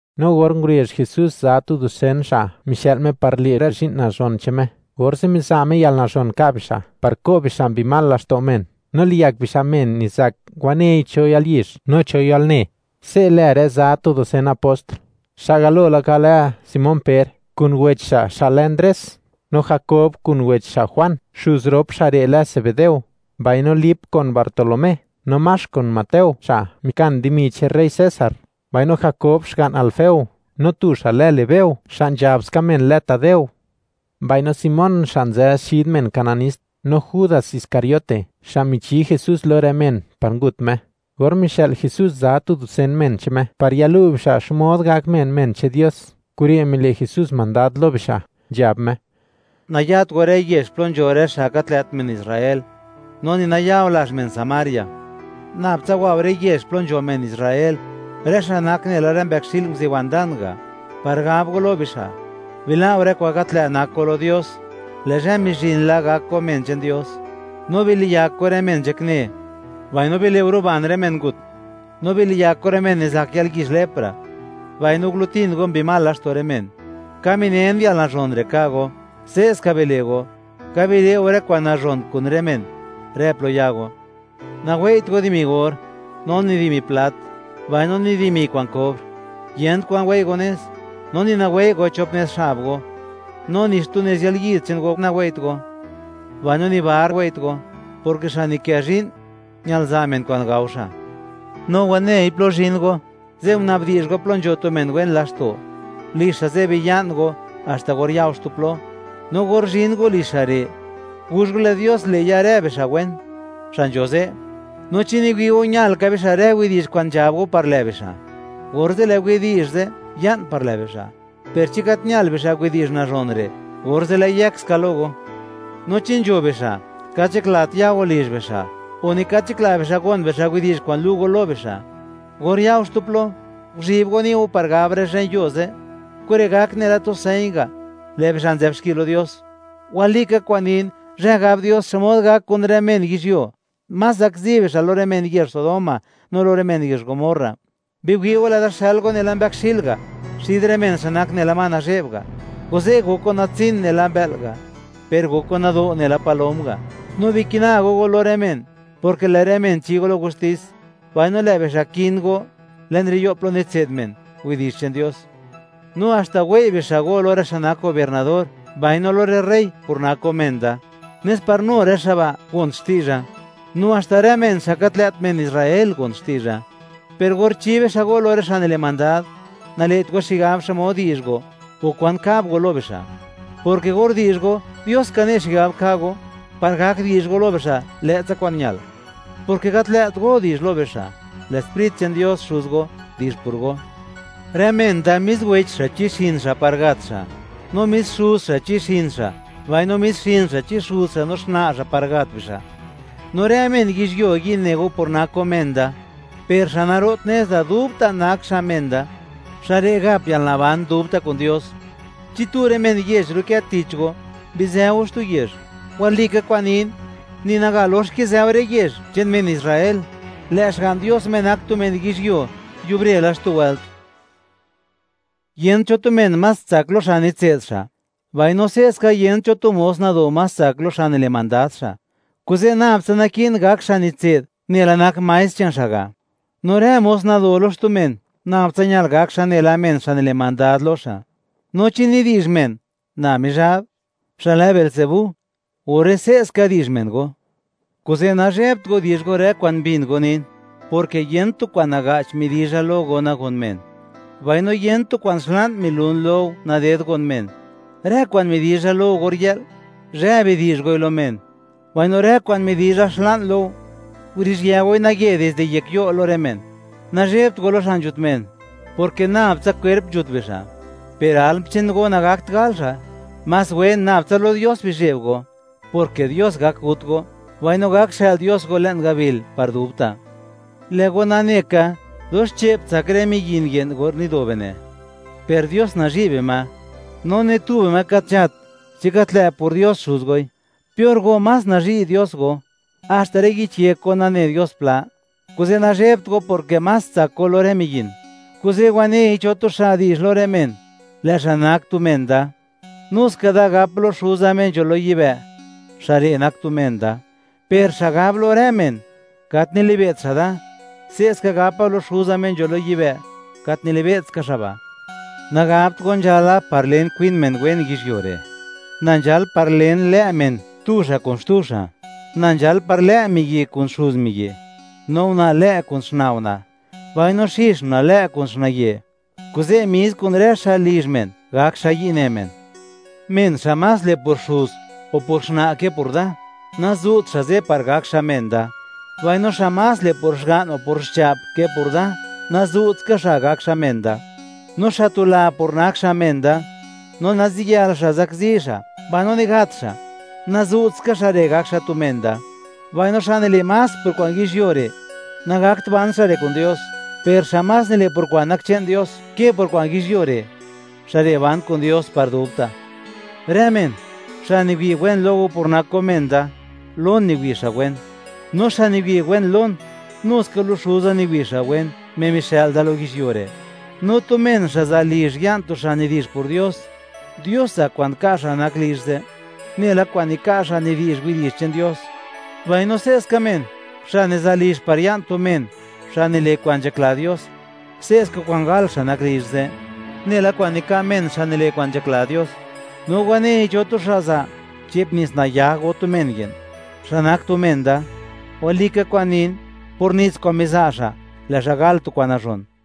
No or ngurezh Jesús za tu dusen xa' mixë'l Me par le' rë zhi'n nazhon che'n Me, orze' miza' Me yalnazhon nka' bixa' par ko' bixa' mbi mal laxto' men, no liyak bixa' men nizak wanei cho yalyizh, no cho yalne. Se' lë rë za tu dusen apost: xa' galo laka lë Simón Per, kun wech xa' xa' lë Ndres; no Jakob kun wech xa' Juan; xuz rop xa' re' lë Zebedeo; mbaino Lip kun Bartolomé, no Max, kun Mateo xa' mikan dimi che'n rey César; mbaino Jakob xga'n Alfeo, no tu xa' lë Lebeo xa' nzhab ska men lë Tadeo; mbaino Simón xa' nzë xid men Kananist, no Judas Iscariote, xa' michi Jesús lo rë men par ngut Me. Or mixë'l Jesús za tu dusen men che'n Me par yalu' bixa' xmod gak men, men che'n Dios, kure' mile' Jesús mandad lo bixa', nzhab Me: ―Nayat go rë yezh plo nzho rë xa' gat lë't men Israel, no ni naya go lazh men Samaria. Nabtsa wa go rë yezh plo nzho men Israel, rë xa' nak nela rë mbëkxi'l nguziwan dan ga', par gab go lo bixa': “Bila' go rë kwa'n gat lë' nak go lo Dios; lë' zhë mizhin la gak go men che'n Dios.” No biliyak go rë men nzhakne, mbaino bile' go ruban rë men ngut, no biliyak go rë men nizak yalyizh lepra, mbaino gulutin go mbi mal laxto' rë men. Ka minen yalnazhon re' ka' go; se'ska bile' go, ka bile' go rë kwa'n nazhon kun rë men rë plo ya go. Nawei't go dimi or, no ni dimi plat, mbaino ni dimi kwa'n kobr; Yent kwan wei' go nez, no ni nawei' go chop nez xab go, no ni xtu nez yalyid che'n go nawei't go, mbaino ni tu bar wei't go, porke xa' nikë zhi'n, ñal za' men kwa'n gao xa'. ’No wanei plo zhin go, ze' gunabdi'zh go plo nzho tu men wen laxto'; lizh xa' ze' biya'n go haxta or ya go xtu plo. No or zhin go lizh xa' re', guzh go, lë' Dios le' ya rë bixa' wen, xa' nzho ze'. No chi niwi' go, ñal ka bixa' rë widi'zh kwa'n nzhab go par lë' bixa', orze' lë' widi'zh ze' ya'n par lë' bixa'. Per chi gat ñal bixa' widi'zh nazhon re', orze' lë'i yëk ska lo go. No chi nzho bixa' gat nzhaklat ya go lizh bixa', o ni gat nzhakla bixa' gon bixa' widi'zh kwa'n lu' go lo bixa'; or ya go xtu plo, guzhib go ni' go par gab rë zhen yuo ze'. Kure' gak nela tu señ ga', lë' bixa' nzë'b xki lo Dios. Walika kwa'n nin, zhë gab Dios xmod gak kun rë men yizhyuo, más zakzi bixa' lo rë men yezh Sodoma no lo rë men yezh Gomorra. ’¡Biwi' go! Lë'da xël go nela mbëkxi'l ga', xid rë men xa' nak nela ma nazhe'b ga'; kuze' gok go natsin nela mbë'l ga', per gok go nado' nela palom ga'. No bikina go go lo rë men, porke lë' rë men chi go lo gustis, mbaino lë' bixa' kin go le'n rë yo' plo nitse'd men widi'zh che'n Dios, no haxta wei' bixa' go lo rë xa' nak gobiernador, mbaino lo rë rey, por nak go men da; nes par nu rë xa' ba' gon xti'zha, no haxta rë men xa' gat lë't men Israel gon xti'zha. Per or chi bixa' go lo rë xa' nile' mandad, nale't go xigab xmod di'zh go, o kwan kab go lo bixa', porke or di'zh go, Dios ka ne' xigab ka' go par gak di'zh go lo bixa' lë'tsa kwa'n ñal, porke gat lë't go di'zh lo bixa'; lë' Sprit che'n Dios Xuz go, di'zh por go. ’Rë men da mis wech xa', chi xa' par gat xa'; no mis xuz xa' chi xin xa', mbaino mis xin xa' chi xuz xa' no xna' xa', par gat bixa'. ’No rë men yizhyuo yi' ne go por nak go men da. Per xa' naro't nez da dubta' nak xa' men da, xa' re' gap yalnaban dubta' kun Dios. Chi tu rë men yezh ru'kë tich go, bizë go xtu yezh; walika kwa'n nin, ni naga lox go kizë go rë yezh che'n men Israel, lë' Xga'n Dios, Me nak tu men yizhyuo, yubre la xtu wëlt. ’Yent cho tu men más tsak lo xa' nitse'd xa', mbaino se'ska, yent cho tu mos nado más tsak xa' lo xa' nile' mandad xa'. Kuze', nab tsa naki'n gak xa' nitse'd nela nak maestr che'n xa' ga', no rë mos nado lo xtu men, nab tsa ñal gak xa' nela men xa' nile' mandad lo xa'. No chi nidi'zh men na Mizhab, xa' lë Beelzebú, orze' se'ska di'zh men go. ’Kuze' nazhebt go di'zh go rë kwa'n mbin go nin, porke yent tu kwa'n naga'ch midizha lo go nagon men; mbaino yent tu kwa'n xla'n milun lo go naded nagon men. Rë kwa'n midizha lo go or yë'l, zhë bidi'zh goi lo men; mbaino rë kwa'n midi'zha xla'n lo go, guruzhië goi naye dizde yek yo' lo rë men. Nazhebt go lo xa' nzhut men, porke nab tsa kwerp nzhut bixa', per alm che'n go nagakt gal xa'. Más wen nab tsa lo Dios bizheb go, porke Dios gak gut go, mbaino gak xë'l Dios go le'n gabil par dubta'. ’Lë' go nane ka, dox che'p tsak rë miyin ye'n or nido bine', per Dios nazhi' bima; no ni tu bima gat nzhat chi gat lë' por Dios Xuz goi. Per go, más nazhi' Dios go, haxta rë yich yek go, nane Dios pla. Kuze' nazhebt go, porke más tsak go lo rë miyin. ’Kuze', wanei cho tu xa' di'zh lo rë men, lë' xa' nak tu men da, nu ska da gap lo Xuza Me nzho lo yibë', xa' re' nak tu men da; per xa' gab lo rë men, gat nilibe't xa' da, se'ska gapa lo Xuza, Me nzho lo yibë', gat nilibe'tska xa' ba'. ’Nagabt go nzhala par len kwin men wen yizhyuo re'; na nzhal par len lë' men, tu xa' kun xtu xa': Na nzhal par lë' miyi' kun xuz miyi', no una' lë' kun xna' una', mbaino xix una' lë' kun xna'ye'. Kuze' mis kun rë xa' lizh men, gak xa' yi' ne men. ’Men xa' más le' por xuz o por xna' ke por da, nazu't xa' ze' par gak xa' men da; mbaino xa' más le' por xga'n o por xcha'p ke por da, nazu't ska xa' gak xa' men da. No xa' tula por nak xa' men da, no naziyël xa' zakzi xa', mbaino ni gat xa', nazu't ska xa' re' gak xa' tu men da. Mbaino xa' nile' más por kwa'n yizhyuo re', nagakt ban xa' re' kun Dios; per xa' más nile' por kwa'n nak che'n Dios ke por kwa'n yizhyuo re', xa' re' ban kun Dios par dubta'. ’Rë men, xa' niwi' wen lo go por nak go men da, lon niwi' xa' wen; no xa' niwi' wen lon, nu ska lo Xuza niwi' xa' wen, Me mixë'l da lo yizhyuo re'. No tu men, xa' za' lizh, ya'n tu xa' nidi'zh por Dios, Dios za' kwa'n ka' xa' nak lizh ze', nela kwa'n nika' xa' nidi'zh widi'zh che'n Dios. Mbaino se'ska men, xa' niza' lizh, par ya'n tu men xa' nile' kwa'n nzhakla Dios, se'ska kwa'n gal xa' nak lizh ze', nela kwa'n nika' men xa' nile' kwa'n nzhakla Dios. No wanei cho tu xa' za' che'p nits nayag go tu men ye'n, xa' nak tu men da; walika kwa'n nin, por nits kwa'n miza' xa', lë' xa' gal tu kwa'n nazhon.